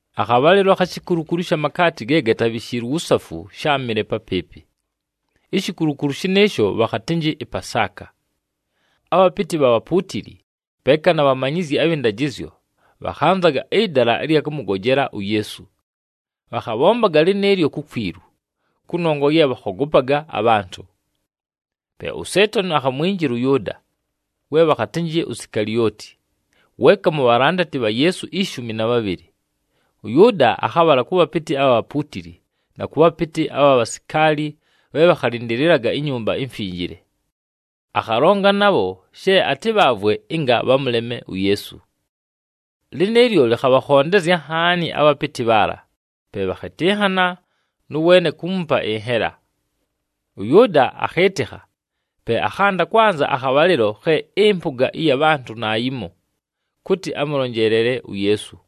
Akhabhalɨlo akhi shikulukulu ɨsha makaati ge gatabhishiilwe uwusafu sháamɨle papɨɨpɨ. Ishikulukulu shɨnɨɨsho bhakhatɨnjɨ ɨPasaaka. Abhapɨtɨ bha bhapuutili, peeka na bhamanyizyi abhɨ ndajɨzyo, bhakhanzaga ɨdala ɨlya kʉmʉgojela uYeesu. Bhakhabhombaga lɨnɨɨlyo kukwilu, kʉnongwa ye bhakhogopaga abhantʉ. Pe uSeetani akhamwinjila ʉYʉʉda, we bhakhatɨnjɨ Sikalioti, weeka mu bhalandati bha Yeesu ishumi na bhabhɨlɨ. ɄYʉʉda akhabhala kʉ bhapɨtɨ abha bhapuutili, na kʉ bhapɨtɨ abha bhasikaali bhe bhakhalɨndɨlɨlaga iNyumba iMfinjile. Akhalonga nabho she atɨbhaavwe ɨnga bhamʉleme uYeesu. Lɨnɨɨlyo, lɨkhabhakhondezya nhaani abhapɨtɨ bhaala, pe bhakhɨtɨnhana nʉ weene kuumupa ɨnhela. ɄYʉʉda akhɨɨtɨkha, pe akhanda kwanza akhabhalɨlo khe ɨmpʉga ɨya bhantʉ naayimo, kʉtɨ amʉlonjeelele uYeesu.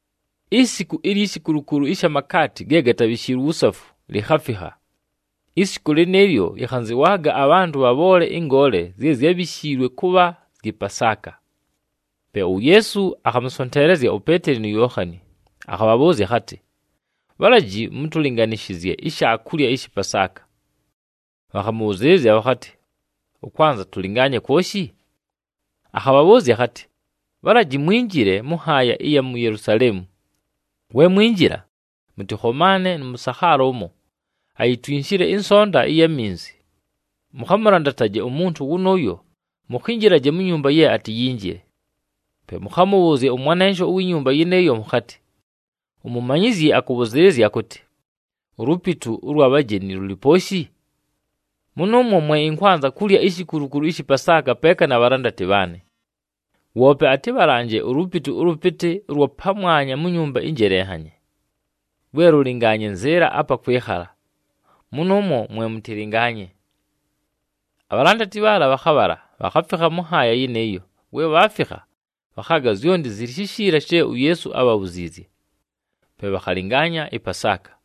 Isiku ilyi shikulukulu ɨsha makaati ge gatabhishiilwe uwusafu, likhafikha. Isiku lɨnɨɨlyo, yɨkhanzɨwaaga abhantʉ bhabhoole ɨngoole zye zyábhishiilwe kʉbha zyɨ Pasaaka. Pe uYeesu akhamʉsonteelezya uPeeteli nu Yookhani, akhabhabhʉʉzya akhatɨ, “Bhalaji mʉtʉlɨnganɨzanye ishaakulya ɨshɨ Pasaaka.” Bhakhamʉbhʉzɨɨlɨzya bhakhatɨ, “Ʉkwanza tʉlɨngaanye kwoshi?” Akhabhabhʉʉzya akhatɨ, “Bhalaji mwinjile mʉ nhaaya ɨya mu Yelusaleemu. We mwinjila, mʉtɨkhomaane nʉ mʉsakhaala ʉmo, ayitwinshile ɨnsonta ɨya minzi. Mʉkhamʉlandataje umuntu wʉnʉʉyo mukhinjilaje mu nyumba ye atiyinjile. Pe mʉkhamʉbhʉʉzye ʉmwanensho uwi nyumba yɨnɨɨyo mʉkhatɨ, ‘UMumanyizyi akʉbhʉzɨɨlɨzya akʉtɨ, “Ulupitu ʉlwa bhajeni lʉlɨ pooshi? Mʉnʉʉmwo mwe ɨnkwanza kulya ishikulukulu ɨshɨ Pasaaka peeka na bhalandati bhaanɨ.” ’ Woope atɨbhalanje ulupitu ʉlʉpɨtɨ ʉlwa pamwanya mu nyumba ɨnjelenhanye, lwe lʉlɨngaanye nzɨɨla apa kwɨkhala. Mʉnʉʉmwo mwe mʉtɨlɨngaanye.” Abhalandati bhaala bhakhabhala, bhakhafikha mʉ nhaaya yɨnɨɨyo. We bhaafikha, bhakhaaga zyonti zɨlɨ shishiila she uYeesu ábhabhuziizye. Pe bhakhalɨngaanya ɨPasaaka.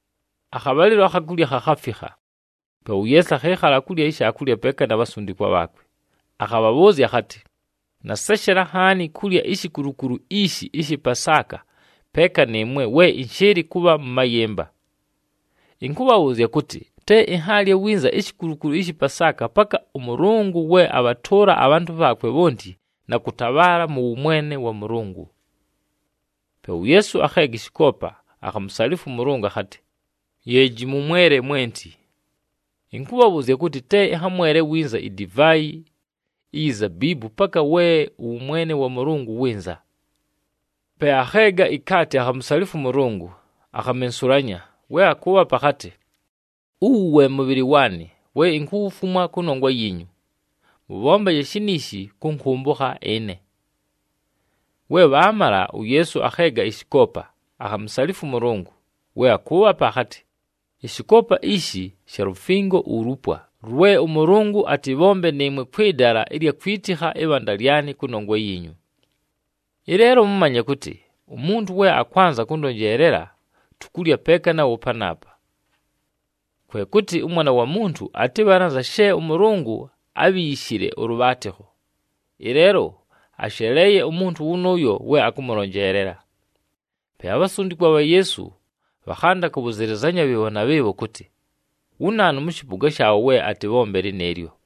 Akhabhalɨlo akha kulya khakhafikha. Pe uYeesu akhɨɨkhala kulya ishaakulya peeka na bhasundikwa bhaakwe. Akhabhabhʉʉzya akhatɨ, “Naseshela nhaani kulya ishikulukulu ishi ɨshɨ Pasaaka peeka nɨɨmwe, we ɨnshɨɨlɨ kʉbha mʉ mayɨmba. Ɨnkʉbhabhʉʉzya kʉtɨ, te ɨnhaalye winza ishikulukulu ɨshɨ Pasaaka paka ʉMʉlʉngʉ we abhatʉʉla abhantʉ bhaakwe bhonti na kʉtabhaala mʉ wʉmwene wa Mʉlʉngʉ.” Pe uYeesu akheega ɨshɨkoopa, akhamusalifwa ʉMʉlʉngʉ akhatɨ, “Yeeji, mʉmwele mwenti! Ɨnkʉbhabhʉʉzya kʉtɨ, te ɨnhamwele winza idivaayi iyi zabiibu paka we ʉwʉmwene wa Mʉlʉngʉ wɨnza.” Pe akheega ikaati, akhamusalifwa ʉMʉlʉngʉ, akhamensulanya. We akʉʉbhapa, akhatɨ, “Uwu we mʉbhɨlɨ waanɨ, we inkuwufumwa kʉnongwa yiinyu. Mʉbhombaje shiniishi, kʉnkʉmbʉkha ɨne.” We bhaamala, uYeesu akheega ɨshɨkoopa, akhamusalifwa ʉMʉlʉngʉ. We akʉʉbhapa, akhatɨ, “Ɨshɨkoopa ishi sha lufingo ulupwa, lwe ʉMʉlʉngʉ atɨbhombe nɨɨmwe kwɨ dala ɨlya kwitikha ɨbhanda lyanɨ kʉnongwa yiinyu. “Ɨleelo mʉmanye kʉtɨ, umuntu we akwanza kʉndonjeelela, tukulya peeka nawo panaapa. Kwe kʉtɨ ʉMwana wa Muntu atɨbhale anza she ʉMʉlʉngʉ ábhiishile ʉlʉbhaatɨkho. Ɨleelo asheleeye, umuntu wʉnʉʉyo we akʉmʉlonjeelela!” Pe abhasundikwa bha Yeesu bhakhanda kʉbhʉzɨlɨzanya bhɨɨbho na bhɨɨbho kʉtɨ, wu naanu mʉ shɨpʉga shaabho we atɨbhombe lɨnɨɨlyo.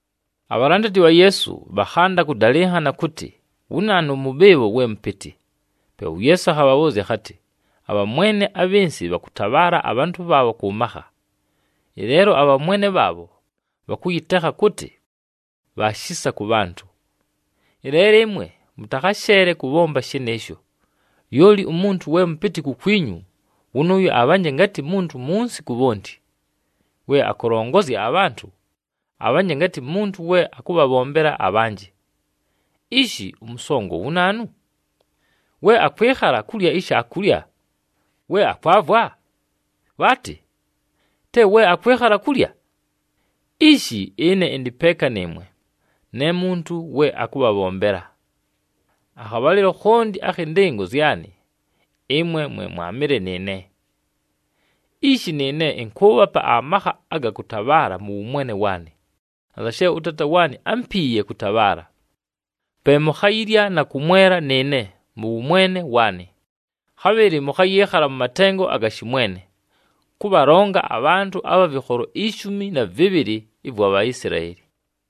Abhalandati bha Yeesu bhakhanda kʉdalɨnhana kʉtɨ, wu naanu mʉ bhɨɨbho we mʉpɨtɨ. Pe uYeesu akhabhabhʉʉzya akhatɨ, “Abhamwene abhɨ nsɨ bhakʉtabhaala abhantʉ bhaabho kʉ makha, ɨleelo abhamwene bhanaabho bhakʉyɨtekha kʉtɨ, Bha Shisa kʉ Bhantʉ. “Ɨleelo ɨmwe, mʉtakhasheele kʉbhomba shɨnɨɨsho. Lyoli umuntu we mʉpɨtɨ kukwinyu, wʉnʉʉyo abhanje ngatɨ muntu munsi ku bhonti. We akʉlongozya abhantʉ, abhanje ngatɨ muntu we akʉbhabhombela abhanjɨ. Ishi! Ʉmʉsongo wu naanu? We akwɨkhala kulya ishaakulya! We akwavwa? Bhaatɨ! Te we akwɨkhala kulya? Ishi, ɨne ɨndɨ peeka nɨɨmwe, ne muntu we akʉbhabhombela. “Akhabhalɨlo khonti akhɨ ndɨngo zyanɨ, ɨmwe mwe mwaamɨle nɨɨne. Ishi, nɨɨne ɨnkʉʉbhapa amakha aga kʉtabhaala mʉ wʉmwene waanɨ, anza she ʉTaata waanɨ ámpiiye kʉtabhaala. Pe mukhayilya na kʉmwela nɨɨne, mʉ wʉmwene waanɨ. Khabhɨlɨ mʉkhayɨɨkhala mʉ matengo aga shɨmwene, kʉbhalonga abhantʉ abha vɨkholo ishumi na vɨbhɨlɨ ɨvwa Bhaisilaeli.”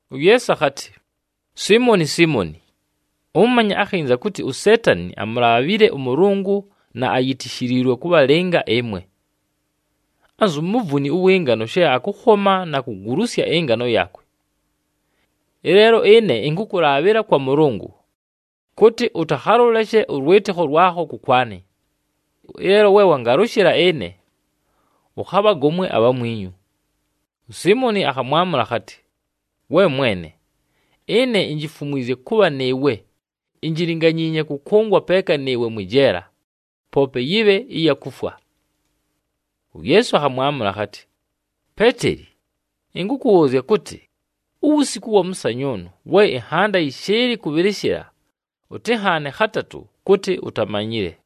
UYeesu akhatɨ, “Siimoni, Siimoni! Ʉmanye akhinza kʉtɨ uSeetani amulaabhile ʉMʉlʉngʉ na ayitishiliilwe kʉbhalɨnga ɨmwe, anzu muvuni ʉwɨ ngano she akʉkhoma na kugulusya ɨngano yaakwe. Ɨleelo ɨne, ɨnkʉkʉlaabhɨla kwa Mʉlʉngʉ, kʉtɨ ʉtakhalʉleshe ʉlwɨtɨkho lwakho kʉkwanɨ. Ɨleelo we wangalʉshɨla ɨne, ʉkhabhagomwe abhamwinyu.” USiimoni akhamwamʉla akhatɨ, “We Mwene! Ɨne injifumwizye kʉbha nɨɨwe, injilinganyiinye kʉkʉngwa peeka nɨɨwe mwɨ jeela, poope yɨbhe ya kufwa!” UYeesu akhamwamʉla akhatɨ, “Peeteli! Ɨnkʉkʉbhʉʉzya kʉtɨ, uwusiku ʉwa mʉsanyʉʉnʉ, we ɨnhanda yɨshɨɨlɨ kʉbhɨlɨshɨla, ʉtɨnhaane khatatʉ kʉtɨ utamanyile.”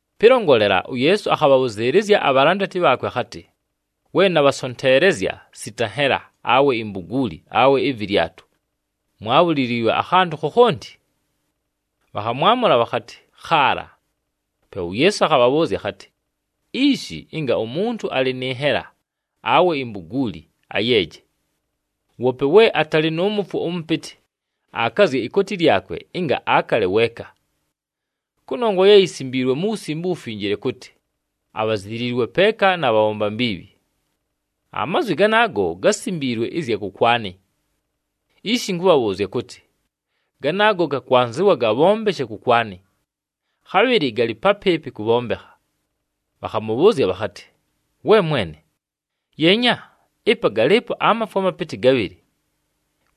Pɨlongolela, uYeesu akhabhabhʉzɨɨlɨzya abhalandati bhaakwe akhatɨ, “We nabhasonteelezya sita nhela, awe imbuguuli awe ɨvɨlyatʉ, mwaabhuliliilwe akhantʉ khokhonti?” Bhakhamwamʉla bhakhatɨ, “Khaala.” Pe uYeesu akhabhabhʉʉzya akhatɨ, “Ishi, ɨnga umuntu alɨ nɨ nhela, awe imbuguuli, ayeeje. Woope we atalɨ nʉ mʉfwo ʉmʉpɨtɨ, akazye ikooti lyakwe, ɨnga akale weeka. Kʉnongwa ye yisimbiilwe mu Wusimbe uWufinjile kʉtɨ, ‘Abhaziliilwe peeka na bhabhomba mbiibhi.’ Amazwi ganaago gásimbiilwe ɨzya kʉkwanɨ. Ishi ɨnkʉbhabhʉʉzya kʉtɨ, ganaago gakwanzɨwa gabhombeshe kʉkwanɨ, khabhɨlɨ galɨ papɨɨpɨ kʉbhombekha.” Bhakhamʉbhʉʉzya bhakhatɨ, “We Mwene! Yeenya! Ɨpa galɨɨpo amafwo amapɨtɨ gabhɨlɨ.”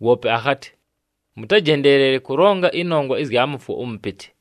Woope akhatɨ, “Mʉtajendeelele kʉlonga ɨnongwa ɨzya mʉfwo ʉmʉpɨtɨ.”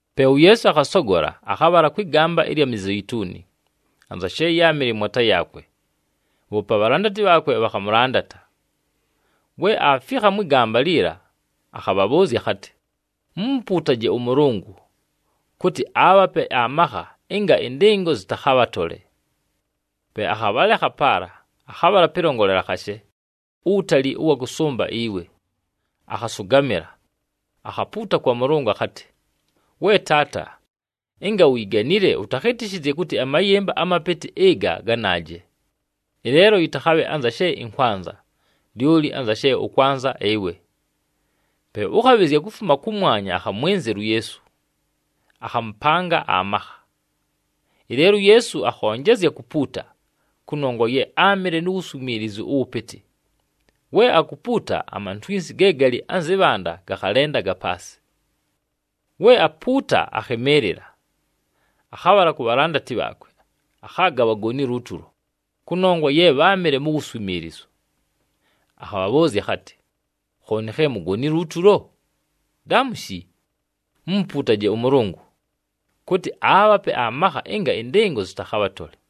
Pe uYeesu akhasogola, akhabhala kwɨ gamba ɨlya Mizeituni, anza she yáamɨle mwata yaakwe. Bhoope abhalandati bhaakwe, bhakhamʉlandata. We aafikha mwɨ gamba liila, akhabhabhʉʉzya akhatɨ, “Mumupuutaje ʉMʉlʉngʉ, kʉtɨ aabhape amakha ɨnga ɨndɨngo zɨtakhabhatole.” Pe akhabhalekha paala, akhabhala pɨlongolela khashe, uwutali ʉwa kʉsʉmba iwe. Akhasʉgamɨla, akhapuuta kwa Mʉlʉngʉ akhatɨ, “We Taata! Ɨnga uyiganile, ʉtakhɨtɨshɨzye kʉtɨ amayɨmba amapɨtɨ ɨga ganaaje! Ɨleelo yɨtakhabhe anza she ɨnkwanza, lyoli anza she ʉkwanza ɨwe.” [ Pe ʉkhabhɨzya kufuma kʉmwanya akhamwɨnzɨla uYeesu, akhamʉpanga amakha. Ɨleelo uYeesu akhonjezya kupuuta, kʉnongwa ye áamɨle nu wuswimiilizu ʉwʉpɨtɨ. We akupuuta, amantwinsi ge galɨ anzɨ bhanda gakhalendaga paasɨ.] We apuuta, akhɨmɨɨlɨla, akhabhala ku bhalandati bhaakwe, akhaaga bhagonile utulo, kʉnongwa ye bháamɨle mu wuswimiilizu. Akhabhabhʉʉzya akhatɨ, “Khooni khe mugonile utulo? Daamushi! Mumupuutaje ʉMʉlʉngʉ, kʉtɨ aabhape amakha ɨnga ɨndɨngo zɨtakhabhatole.”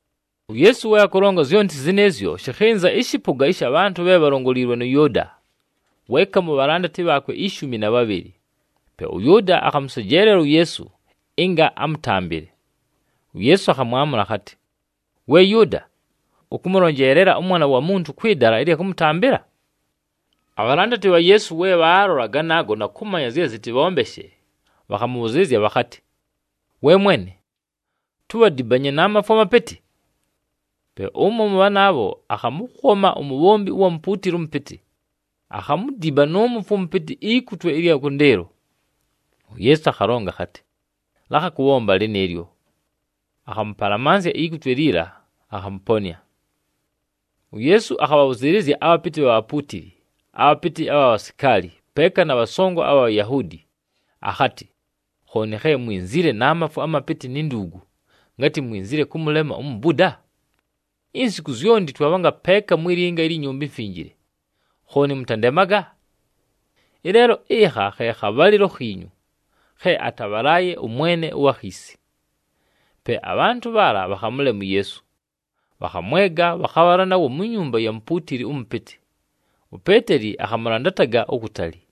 UYeesu we akʉlonga zyonti zɨnɨɨzyo, shɨkhɨnza ɨshɨpʉga ɨsha bhantʉ bhe bhalongoliilwe nʉ Yʉʉda, weeka mu bhalandati bhaakwe ishumi na bhabhɨlɨ. Pe ʉYʉʉda akhamʉsejeelela uYeesu ɨnga amʉtambɨle. UYeesu akhamwamʉla akhatɨ, “We Yʉʉda! Ʉkʉmʉlonjeelela ʉMwana wa Muntu kwɨ dala ɨlya kʉmʉtambɨla?” Abhalandati bha Yeesu we bhaalola ganaago na kʉmanya zye zɨtɨbhombeshe, bhakhamʉbhʉzɨɨlɨzya bhakhatɨ, “We Mwene! Tubhadibanye na mafwo amapɨtɨ?” Pe ʉmo mʉ bhanaabho akhamʉkhoma umubhombi ʉwa mupuutili ʉmʉpɨtɨ, akhamudiba nʉ mʉfwo ʉmʉpɨtɨ ikutwe ɨlya kʉndɨɨlo. UYeesu akhalonga akhatɨ, “Lakha kʉbhomba lɨnɨɨlyo!” Akhamʉpalamansya ikutwe liila, akhamʉponɨa. UYeesu akhabhabhʉzɨɨlɨzya abhapɨtɨ bha bhapuutili, abhapɨtɨ abha bhasikaali, peeka na bhasongo abha Bhayahuudi, akhatɨ, “Khooni khe mwinzile na mafwo amapɨtɨ ni nduugu, ngatɨ mwinzile kʉmʉlema umubuda? Insiku zyonti twabhanga peeka mwi linga ilyi Nyumba iMfinjile, khooni mʉtandemaga! Ɨleelo, ɨkha khe khabhalɨlo khiinyu, khe atabhalaaye ʉmwene ʉwa khiisi.” Pe abhantʉ bhaala bhakhamʉlema uYeesu, bhakhamwega, bhakhabhala nawo mu nyumba ya mupuutili ʉmʉpɨtɨ. UPeeteli akhamʉlandataga ukutali.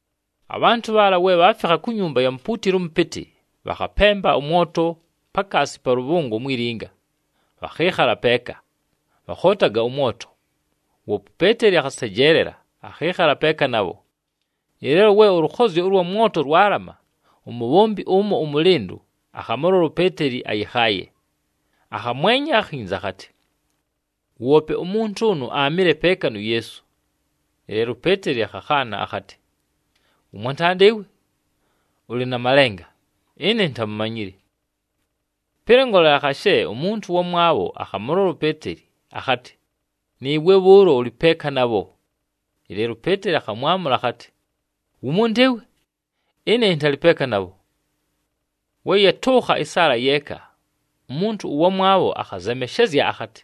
Abhantʉ bhaala we bhaafikha ku nyumba ya mupuutili ʉmʉpɨtɨ, bhakhapemba ʉmwoto pakaasi pa lʉbhʉngo mwi linga, bhakhɨɨkhala peeka, bhakhootaga ʉmwoto. Woope uPeeteli akhasejeelela, akhɨɨkhala peeka nabho. Ɨleelo we ʉlʉkhozyo ʉlwa mwoto lwalama, umubhombi ʉmo ʉmʉlɨndʉ, akhamʉlola uPeeteli ayɨkhaaye, akhamwenya akhinza, akhatɨ, “Woope umuntu ʉnʉ aamɨle peeka nu Yeesu.” Ɨleelo uPeeteli akhakhaana akhatɨ, “Wʉmwantanda ɨwe, ʉlɨ na malenga, ɨne intamumanyile!” Pɨlongolela khashe, umuntu ʉwamwabho akhamʉlola uPeeteli akhatɨ, “Nɨɨwe bhʉʉlo ʉlɨ peeka nabho.” Ɨleelo uPeeteli akhamwamʉla akhatɨ, “Wumuntu ɨwe! Ɨne ɨntalɨ peeka nabho!” We yatʉʉkha ɨsaala yeeka, umuntu ʉwamwabho akhazemeshezya akhatɨ,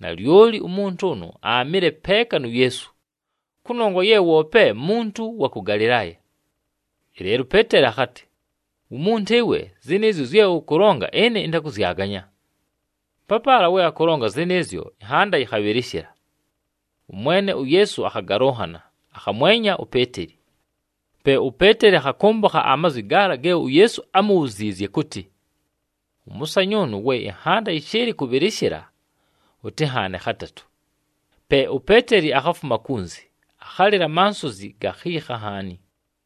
“Nalyoli umuntu ʉnʉ aamɨle peeka nu Yeesu! Kʉnongwa ye woope muntu wa kʉ Galɨlaaya!” Ɨleelo uPeeteli akhatɨ, “Wumuntu ɨwe! Zɨnɨɨzyo zye ʉkʉlonga, ɨne ɨntakʉzyaganya!” Papaala we akʉlonga zɨnɨɨzyo, ɨnhanda yɨkhabhɨlɨshɨla. ɄMwene uYeesu akhagalʉnhana, akhamwenya uPeeteli. Pe uPeeteli akhakʉmbʉkha amazwi gaala ge uYeesu ámubhuziizye kʉtɨ, “Ʉmʉsanyʉʉnʉ, we ɨnhanda yɨshɨɨlɨ kʉbhɨlɨshɨla, ʉtɨnhaane khatatʉ.” Pe uPeeteli akhafuma kunzi, akhalɨla amansozi gakhiikha nhaani.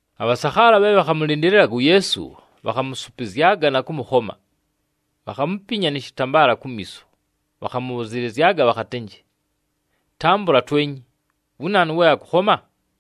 Abhasakhaala bhe bhakhamʉlɨndɨlɨlaga uYeesu, bhakhamʉsʉpɨzyaga na kʉmʉkhoma. Bhakhamupinya nɨ shɨtambaala kumiiso, bhakhamʉbhʉzɨlɨzyaga bhakhatɨnjɨ, “Tambʉla twenye! Wu naanu we akʉkhoma?”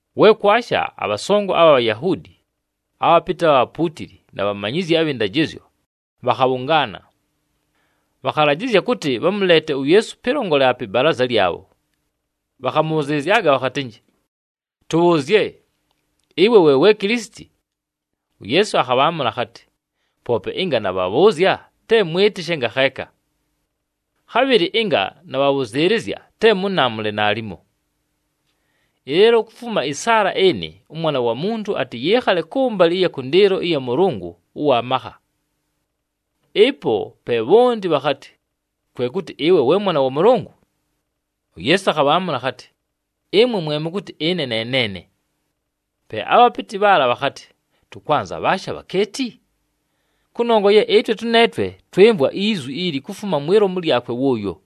We kwasha, abhasongo abha Bhayahuudi, abhapɨtɨ bha bhapuutili, na bhamanyizyi abhɨ ndajɨzyo, bhakhabhʉngaana. Bhakhalajɨzya kʉtɨ bhamʉleete uYeesu pɨlongolela pɨ balaaza lyabho, bhakhamʉbhʉzɨlɨzyaga bhakhatɨnjɨ, “Tʉbhʉʉzye! Ɨwe we we Kilisiti?” UYeesu akhabhaamʉla akhatɨ, “Poope ɨnga nabhabhʉʉzya, te mwɨtɨshe ngakheeka. Khabhɨlɨ ɨnga nabhabhʉzɨɨlɨzya, te mʉnaamʉle naalimo. Ɨleelo kufuma ɨsaala ɨnɨ, ʉMwana wa Muntu atɨyɨɨkhale kʉmbalɨ ɨya kʉndɨɨlo ɨya Mʉlʉngʉ ʉwa makha.” Ɨpo pe bhonti bhakhatɨ, “Kwe kʉtɨ ɨwe we Mwana wa Mʉlʉngʉ?” UYeesu akhabhaamʉla akhatɨ, “Ɨmwe mwe mʉkʉtɨ ɨne ne neene!” Pe abhapɨtɨ bhaala bhakhatɨ, “Tʉkwanza bhaashi abhakeeti? Kʉnongwa ye ɨtwe tʉneetwe twɨmvwa izwi ili kufuma mwi lomu lyakwe wʉʉyo!”